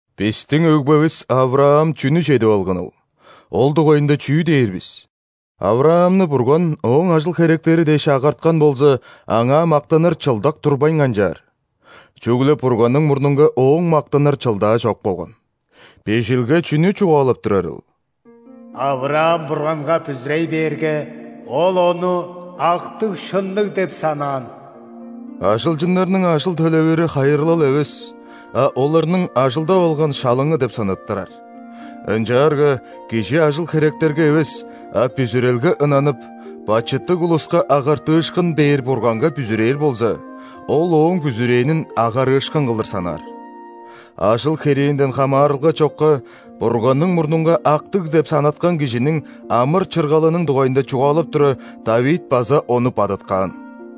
Бистиң өгбевис ·Авраам чүнү чедип алганыл, ол дугайында чүү дээр бис? – Авраамны Бурган ооң ажыл-херектери дээш агарткан болза, аңаа мактаныр чылдак турбайн канчаар. Чүгле Бурганның мурнунга ооң мактаныр чылдаа чок болган. Бижилге чүнү чугаалап турарыл? «Авраам Бурганга бүзүрей бээрге, Ол ону актыг-шынныг деп санаан». – Ажылчыннарның ажыл төлевири хайырлал эвес, а оларның ажылдап алган шалыңы деп санаттырар. Ынчаарга кижи ажыл-херектерге эвес, а бүзүрелге ынанып, бачыттыг улуска агартыышкын бээр Бурганга бүзүрээр болза, Ол ооң бүзүрээнин агарыышкын кылдыр санаар. Ажыл-херээнден хамаарылга чокка Бурганның мурнунга актыг деп санаткан кижиниң амыр-чыргалының дугайында чугаалап тура, ·Давид база ону бадыткаан: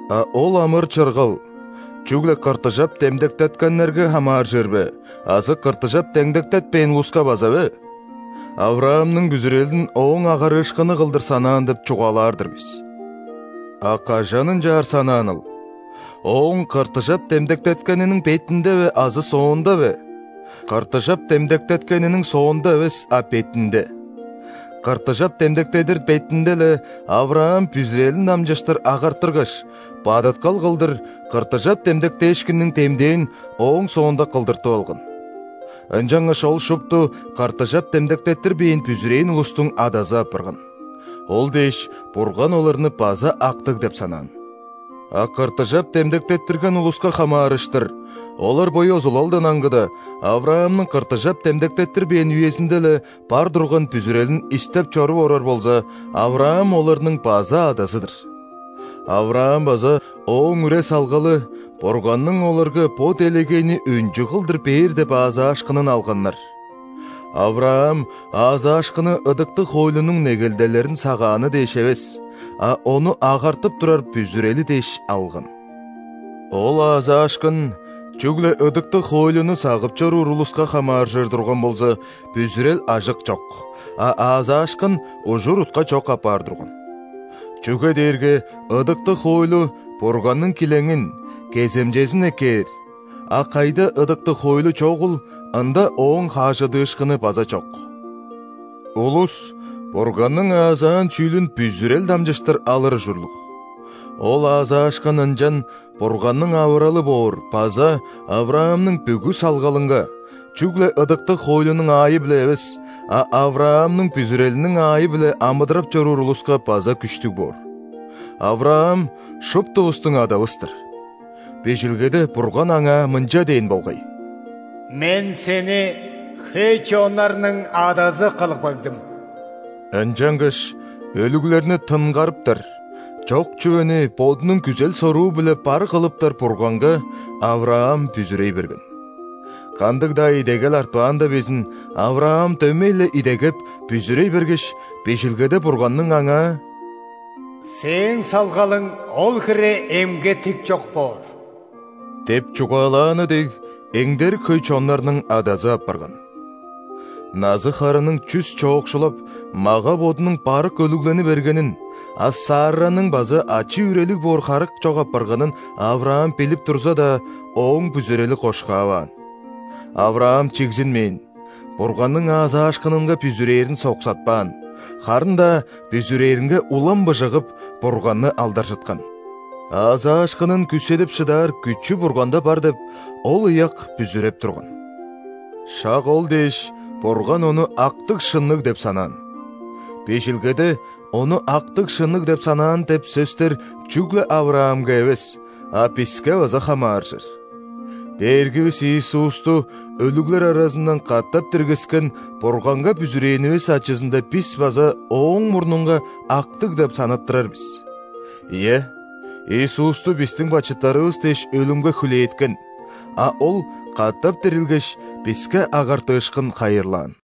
А ол амыр-чыргал чүгле ·кыртыжап демдектеткеннерге хамааржыр бе азы кыртыжап демдектетпээн улуска база бе? ·Авраамның бүзүрелин ооң агарыышкыны кылдыр санаан деп чугаалаар-дыр бис. А кажан ынчаар санааныл? Ооң кыртыжап демдектеткениниң бетинде бе азы соонда бе? – Кыртыжап демдектеткениниң соонда эвес, а бетинде! Кыртыжап демдектедир бетинде-ле, Авраам бүзүрелин дамчыштыр агартыргаш, бадыткал кылдыр кыртыжап демдектээшкинниң демдээн ооң соонда кылдыртып алган. Ынчангаш ол шупту кыртыжап демдектеттирбээн бүзүрээн улустуң адазы апарган. Ол дээш, Бурган оларны база актыг деп санаан. А кыртыжап демдектеттирген улуска хамаарыштыр – олар бо ёзулалдан аңгыда, Авраамның кыртыжап демдектеттирбээн үезинде-ле бар турган бүзүрелин истеп чоруп орар болза, Авраам оларның база адазы-дыр. Авраам база ооң үре-салгалы Бурганның оларга бо делегейни өнчү кылдыр бээр деп аазаашкынын алганнар. Авраам аазаашкынны ыдыктыг хоойлунуң негелделерин сагааны дээш эвес, а ону агартып турар бүзүрели дээш алган. Ол аазаашкын чүгле ыдыктыг хоойлуну сагып чоруур улуска хамааржыр турган болза, бүзүрел ажык чок, а аазаашкын – ужур-утка чок апаар турган. Чүге дээрге ыдыктыг хоойлу Бурганның килеңин, кеземчезин эккээр; а кайда ыдыктыг хоойлу чогул, ында ооң хажыдыышкыны база чок. Улус Бурганның аазаан чүүлүн бүзүрел дамчыштыр алыр ужурлуг. Ол аазаашкын ынчан Бурганның авыралы боор база Авраамның бүгү салгалынга: чүгле ыдыктыг хоойлунуң аайы-биле эвес, а Авраамның бүзүрелиниң аайы-биле амыдырап чоруур улуска база күштүг боор. Авраам – шуптувустуң адавыс-тыр. Бижилгеде Бурган аңаа мынча дээн болгай: «Мен сени хөй чоннарның адазы кылып кагдым». Ынчангаш өлүглерни тынгарыптар, чок чүвени Бодунуң күзел-соруу-биле бар кылыптар Бурганга Авраам бүзүрей берген. Кандыг-даа идегел артпаанда безин, Авраам дөмей-ле идегеп, бүзүрей бергеш, Бижилгеде Бурганның аңаа: «Сээң салгалың ол хире эмге-тикчок боор» – деп чугаалааны дег, эңдерик хөй чоннарның адазы апарган. Назы-харының чүс чоокшулап, мага-бодунуң барык өлүглени бергенин, а Сарраның база ачы-үрелиг боор харык чок апарганын Авраам билип турза-даа, ооң бүзүрели кошкаваан. Авраам чигзинмээн, Бурганның аазаашкынынга бүзүрээрин соксатпаан, харын-даа бүзүрээнинге улам быжыгып, Бурганны алдаржыткан. Аазаашкынын күүседип шыдаар күчү Бурганда бар деп, ол ыяк бүзүреп турган. Шак ол дээш, Бурган ону актыг-шынныг деп санаан. Бижилгеде «Ону актыг-шынныг деп санаан» деп сөстер чүгле Авраамга эвес, а биске база хамааржыр. Дээргивис Иисусту өлүглер аразындан катап диргискен Бурганга бүзүрээнивис ачызында бис база Ооң мурнунга актыг деп санаттырар бис. Ийе, Иисусту бистиң бачыттарывыс дээш өлүмге хүлээткен, а Ол катап дирилгеш, биске агартыышкын хайырлаан.